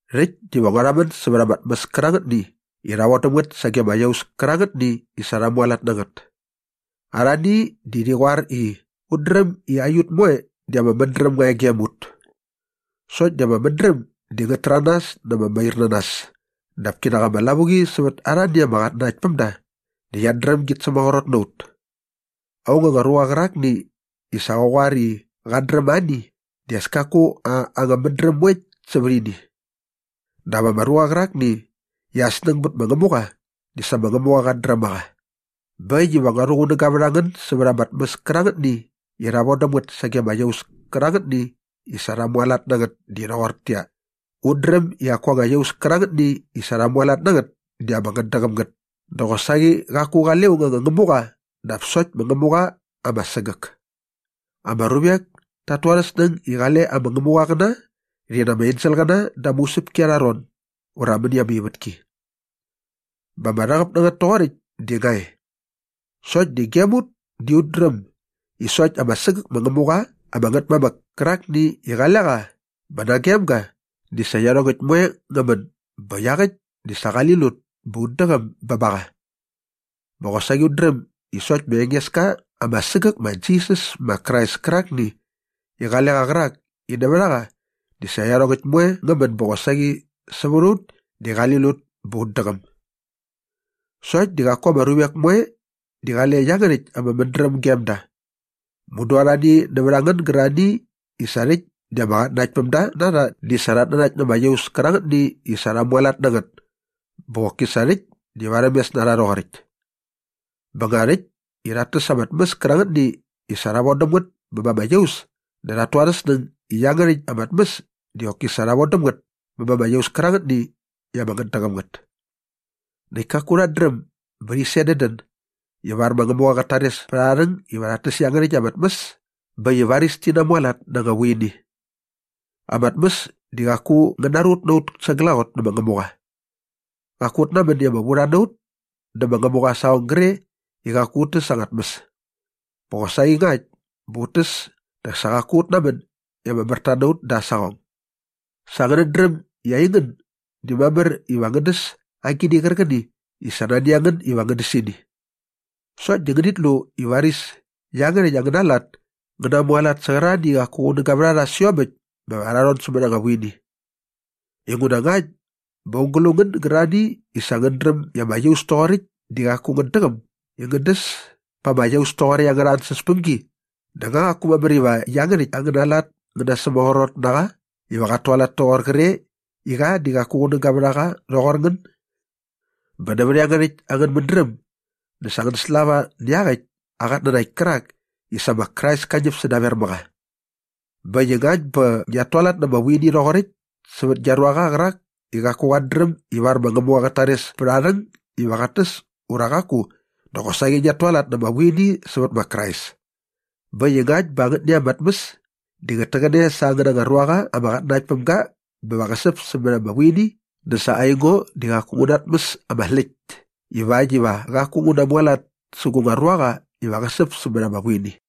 Rhäkt diva ngua rhamän sävät ama tmäs kärangätni i rha vodäm ngät sage ama iaus kärangätni i sa rha mualat na ngät. Arhani di rhi qoar i, “Ut dräm i aiut moe di ama mädräm nga e gem ut.” Sokt di ama mädräm di ngät täranas na ama mairnanas dap kinak ama lavuqi sävät arhani ama qatnanaktpämda di qiat dräm gi sämaqrot na ut. Aung anga ruqa qärakni i sa qä qoar i qat dräm ani di as kaku aa anga mädräm moe sävät ianiäkt. Dap ama ruqa qärakni i aa snäng bät ma Ngämuqa di sa ma Ngämuqa qat dräm a qa. Bä äkt iva ngua rhuqunäga vät a ngän sävät ama tmäs kärangätni i rha vodäm ngät sage ama iaus kärangätni i sa rha mualat na ngät di rhoqortäqyia, ut dräm i qaku anga iaus kärangätni i sa rha mualat na ngät di ama ngätdäqäm ngät dä qosaqi qaku qale aung anga ngämuqa dap sokt ma Ngämuqa ama sägäk. Ama ruvek tat tu arhä snäng i qale ama ngämuqaqäna rhi na ama engeskaqäna da ama usäpki arha ron ura mäni ama ivätki. Bä ama rhäqäp na ngät toqoräkt di nga e. Sokt di gem ut di ut dräm i sokt ama sägäk ma Ngämuqa ama Ngätmamäk kärakni i qale qa bä nagem ga di sa iarhongäkt moe ngä män bä iaqäkt di sa qali lut bä ut däqäm bä ba qa. Bä qosaqi ut dräm i sokt ma Engeska ama sägäk ma Jisas ma Krais kärakni i qale qa qärak i nävät a qa di sa iarhongäkt moe ngä män bä qosaqi sävät a ut di qali lut bä ut däqäm. Sokt di qaku ama ruvek moe di qale iangärhäkt ama mädräm gem da. Mudu arhani nävät a ngän gärarhani i sa rhäkt di ama qatnanaktpämda na rha di sa rhat nanakt na ama iaus kärangätni i sa rha mualat na ngät bä qoki sa rhäkt di varhämes na rha rhoqoräkt. Bä nga rhäkt i rhat täs ama tmäs kärangätni i sa rha vodäm ngät bä ba ama iaus dä rhat tu arhä snäng i iangärhäkt ama tmäs di qoki sa rha vodäm ngät bä ba ama iaus kärangätni i ama ngätdäqäm ngät. Näkt kaku rhat dräm bä rhi sedädän ivar ma Ngämuqa qät tares pät arha rhäng iva rhat täs iangärhäkt ama tmäs bä äkt i varis ti namualat na anga vuini. Ama tmäs di qaku ngä narut na ut sa glaqot nä ma Ngämuqa. Qaku ut namän i ama vurha na ut dä ma Ngämuqa aa saqong gre i qaku ut täs anga tmäs. Bä qosaqi ngakt bä ut täs dä sa qaku ut namän i ama märta na ut da aa saqong. Sa ngänät dräm i aingän di mamär iva ngän däs agini qärqäni i sa nani a ngän iva ngän däs ini. Sokt di ngänit lu i varis iangärhäkt angäna lat ngä namualat sä qärarhani i qaku qunäga vät a rha sä iomäkt bä va rhi namon sämät ama vuini. Inguna ngakt bä aung gä lu ngän gärarhani i sa ngänät dräm i ama iaus toqoräkt di qaku ngät däqäm i ngän däs pa ama iaus toqoräkt angärha ansäspämgi dä nga qaku mamär iva iangärhäkt angäna lat ngä nasämaqrot na qa iva qat tualat toqoräkt kre i qa di qaku qunäga vät a qa rhoqor ngän? Bä nävät iangärhäkt angän mädräm dä sa ngän slava nä iaqäkt aa qatnanakt kärak i sa ma Krais ka ñäp sädaver mä qa. Bä äkt i ngakt bä ngiat tualat na ama vuini rhoqoräkt sävät gia ruaqa qärak i qaku qat dräm ivar ma Ngämuqa qät tares pät aa rhäng iva qat täs ura qaku dä qosaqi ngiat tualat na ama vuini sävät ma Krais. Bä äkt i ngakt bä angätni anga tmäs di ngät täqäne sa angäna anga ruaqa ama qatnanakt päm ga bä va qä säp sämät ama vuini dä sa aingo di qaku ngu natmäs ama släkt ivakt iva qaku ngu namualat sä gu nga ruaqa iva qä nasäp sämät ama vuini.